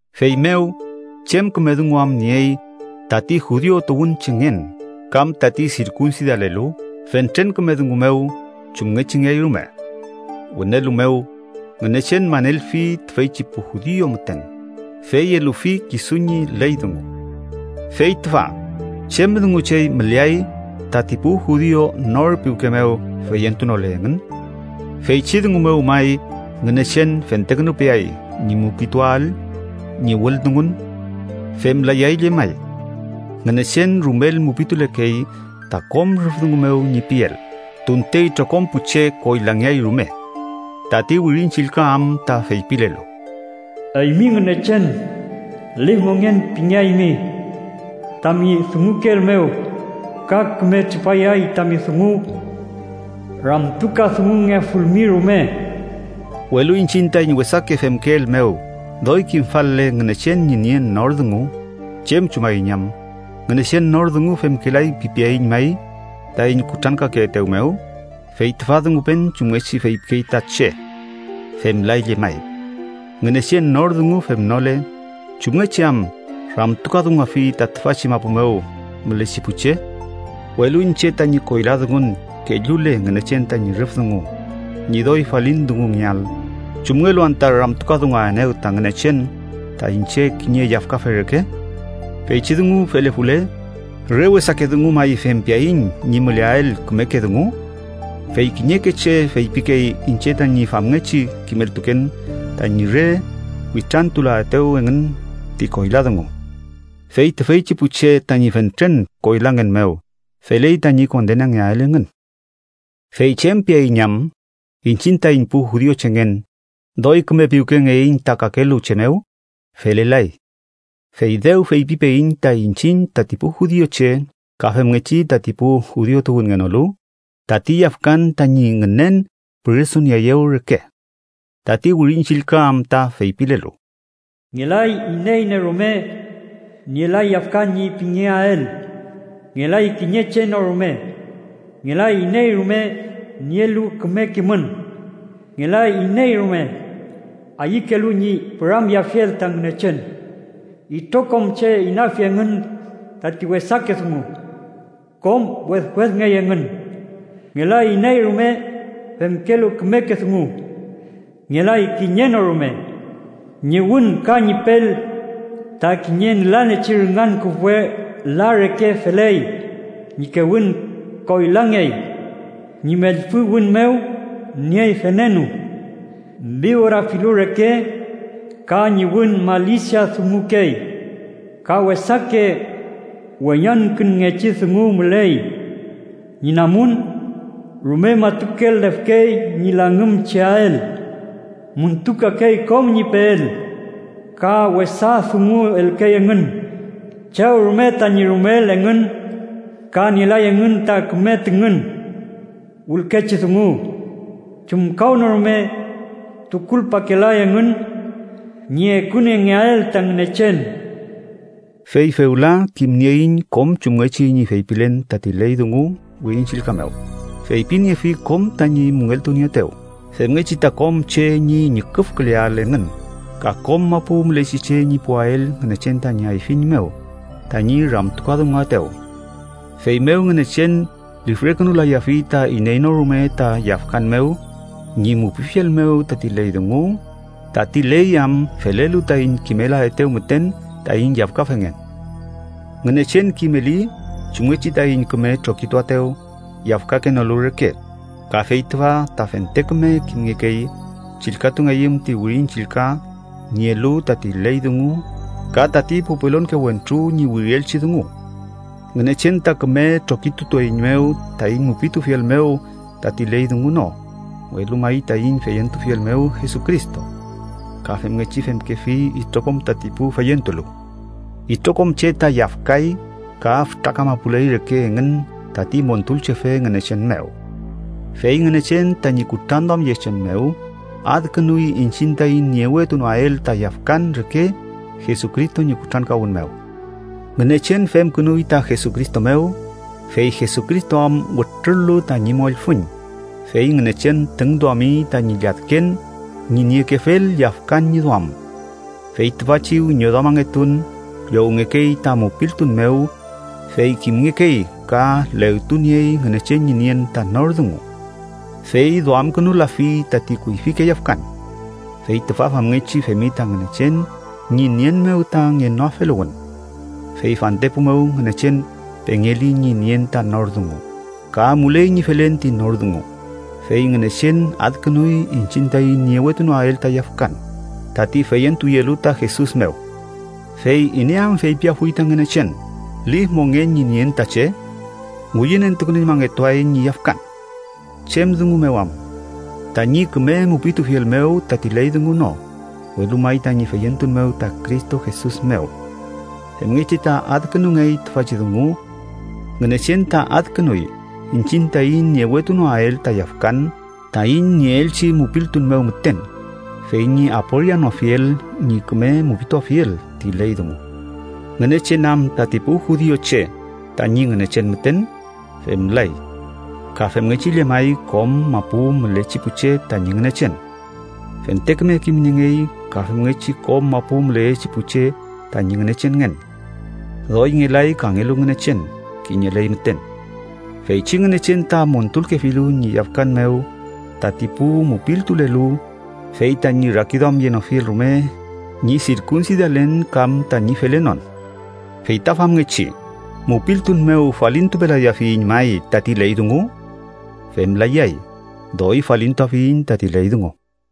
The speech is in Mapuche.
Feymew, ¿chem küme dungu am niey tati judiu tuwünchengen kam tati sirkunsidalelu? Fentren küme dungu mew chumngechingeay rume. Wünelu mew, Ngünechen manelfi tüfeychi pu judiu müten, fey elufi kisu ñi ley dungu. Fey tüfa, ¿chem dungu chey müleay tati pu judiu nor piwke mew feyentunole engün? ¿Feychi dungu mew may Ngünechen fentekünupeay ñi mupituael ñi wüldungun? ¡Femlayay llemay! Ngünechen rumel mupitulekey ta kom rüf dungu mew ñi piel, tunte itrokom pu che koylangeay rume. Tati Wirin Chillka am ta feypilelu: “¡Eymi Ngünechen! Lif mongen pingeaymi tami dungukeel mew, ka küme tripayay tami dungu ramtukadungungefulmi rume.” Welu iñchiñ taiñ wesake femkeel mew doy kimfal-le Ngünechen ñi nien nor dungu, ¿chem chumaiñ am? Ngünechen nor dungu femkelay pipeaiñ may taiñ kutrankakeetew mew. (Fey tüfa dungupen chumngechi feypikey ta che). ¡Femlay llemay! Ngünechen nor dungu femnole, ¿chumngechi am ramtukadunguafi ta tüfachi mapu mew mülechi pu che? Welu iñche tañi koyla dungun kellule Ngünechen tañi rüf dungu ñi doy falin dungungeael, ¿chumngelu anta ramtukadunguaenew ta Ngünechen ta iñche kiñe yafkafe reke? Feychi dungu felefule, ¿re wesake dungu may fempeaiñ ñi müleael kümeke dungu? Fey kiñeke che feypikey iñche tañi famngechi kimeltuken tañi re witrantulaetew engün ti koyla dungu. Fey tüfeychi pu che tañi fentren koylangen mew, feley tañi kondenangeael engün. Fey ¿chem piaiñ am? Iñchiñ taiñ pu judiuchengen, ¿doy küme piwkengeiñ ta kakelu che mew? ¡Felelay! Fey dew feypipeiñ ta iñchiñ tati pu judiuche ka femngechi tati pu judiu tuwünngenolu, tati yafkan tañi ngünen püresunieeyew reke. Tati Wirin Chillka am ta feypilelu: “¡Ngelay iney no rume nielay yafkan ñi pingeael! ¡Ngelay kiñe che no rume! Ngelay iney rume nielu küme kimün. Ngelay iney rume ayükelu ñi püramyeafiel ta Ngünechen. Itrokom che inafi engün tati wesake dungu. Kom wedwedngey engün. ¡Ngelay iney rume femkelu kümeke dungu! ¡Ngelay kiñe no rume!” “Ñi wün ka ñi pel ta kiñe nülalechi rüngan küfwe la reke feley, ñi kewün koylangey”, “ñi mellfü wün mew niey venenu, vibora filu reke.” “Ka ñi wün malisia dungukey ka wesake weñangkünngechi dungu müley.” “Ñi namun rume matukel lefkey ñi langümcheael, müntukakey kom ñi peel ka wesa dungu elkey engün chew rume tañi rumeel engün, ka nielay engün ta küme tüngün wülkechi dungu.” “Chumkawnorume tukulpakelay engün ñi ekuniengeael ta Ngünechen.” Fey fewla kimnieiñ kom chumngechi ñi feypilen tati ley dungu Wirin Chillka mew, feypiniefi kom tañi müngeltunieetew, femngechi ta kom che ñi ñüküfküleael engün ka kom mapu mülechi che ñi puwael Ngünechen tañi ayfiñ mew tañi ramtukadunguaetew. Feymew Ngünechen lifrekünulayafi ta iney no rume ta yafkan mew ñi mupifiel mew tati ley dungu, tati ley am felelu taiñ kimelaetew müten taiñ yafkafengen. Ngünechen kimeli chumngechi taiñ küme trokituaetew yafkakenolu reke, ka fey tüfa ta fente küme kimngekey chillkatungeyüm ti Wirin Chillka nielu tati ley dungu ka tati pu pelonke wentru ñi wirielchi dungu: Ngünechen ta küme trokitutueiñmew taiñ mupitufiel mew tati ley dungu no, welu may taiñ feyentufiel mew Jesucristo. Ka femngechi femkefi itrokom tati pu feyentulu. Itrokom che ta yafkay ka fütra kamapuley reke engün tati Montulchefe Ngünechen mew. Fey Ngünechen, tañi kutranduamyechen mew, adkünuy iñchiñ taiñ niewetunoael ta yafkan reke Jesucristo ñi kutrankawün mew. Ngünechen femkünuy ta Jesucristo mew, fey Jesucristo am wütrul-lu tañi mollfüñ, fey Ngünechen tüngduami tañi lladken ñi niekefel yafkan ñi duam. Fey tüfachi wiñoduamangetun llowngekey ta mupiltun mew, fey kimngekey ka legtuniey Ngünechen ñi nien ta nor dungu. Fey duamkünulafi tati kuyfike yafkan. Fey tüfa famngechi femi ta Ngünechen ñi nien mew ta ngenoafeluwün. Fey fantepu mew Ngünechen pengeli ñi nien ta nor dungu, ka amuley ñi felen ti nor dungu, fey Ngünechen adkünuy iñchiñ taiñ niewetunoael ta yafkan, tati feyentuyelu ta Jesus mew. Fey ¿iney am feypiafuy ta Ngünechen lif mongen ñi nien ta che? ¡Ngüyünentukünuñmangetuay ñi yafkan! ¿Chem dungu mew am? Tañi küme mupitufiel mew tati ley dungu no, welu may tañi feyentun mew ta Cristo Jesus mew. Femngechi ta adkünungey tüfachi dungu: Ngünechen ta adkünuy iñchiñ taiñ niewetunoael ta yafkan taiñ nieelchi mupiltun mew müten, fey ñi aporianofiel ñi küme mupituafiel ti ley dungu. ¿Ngünechen am tati pu judiuche tañi Ngünechen müten? Femlay. Ka femngechi llemay kom mapu mülechi pu che tañi Ngünechen. ¡Fente küme kimniengey ka femngechi kom mapu müleyechi pu che tañi Ngünechenngen. Doy ngelay kangelu Ngünechen. Kiñeley müten. Feychi Ngünechen ta montulkefilu ñi yafkan mew tati pu mupiltulelu, fey tañi rakiduamyenofiel rume ñi sirkunsidalen kam tañi felenon! Feyta famngechi, ¿mupiltun mew falintupelafiyiñ may tati ley dungu? ¡Femlayay! Doy falintuafiyiñ tati ley dungu.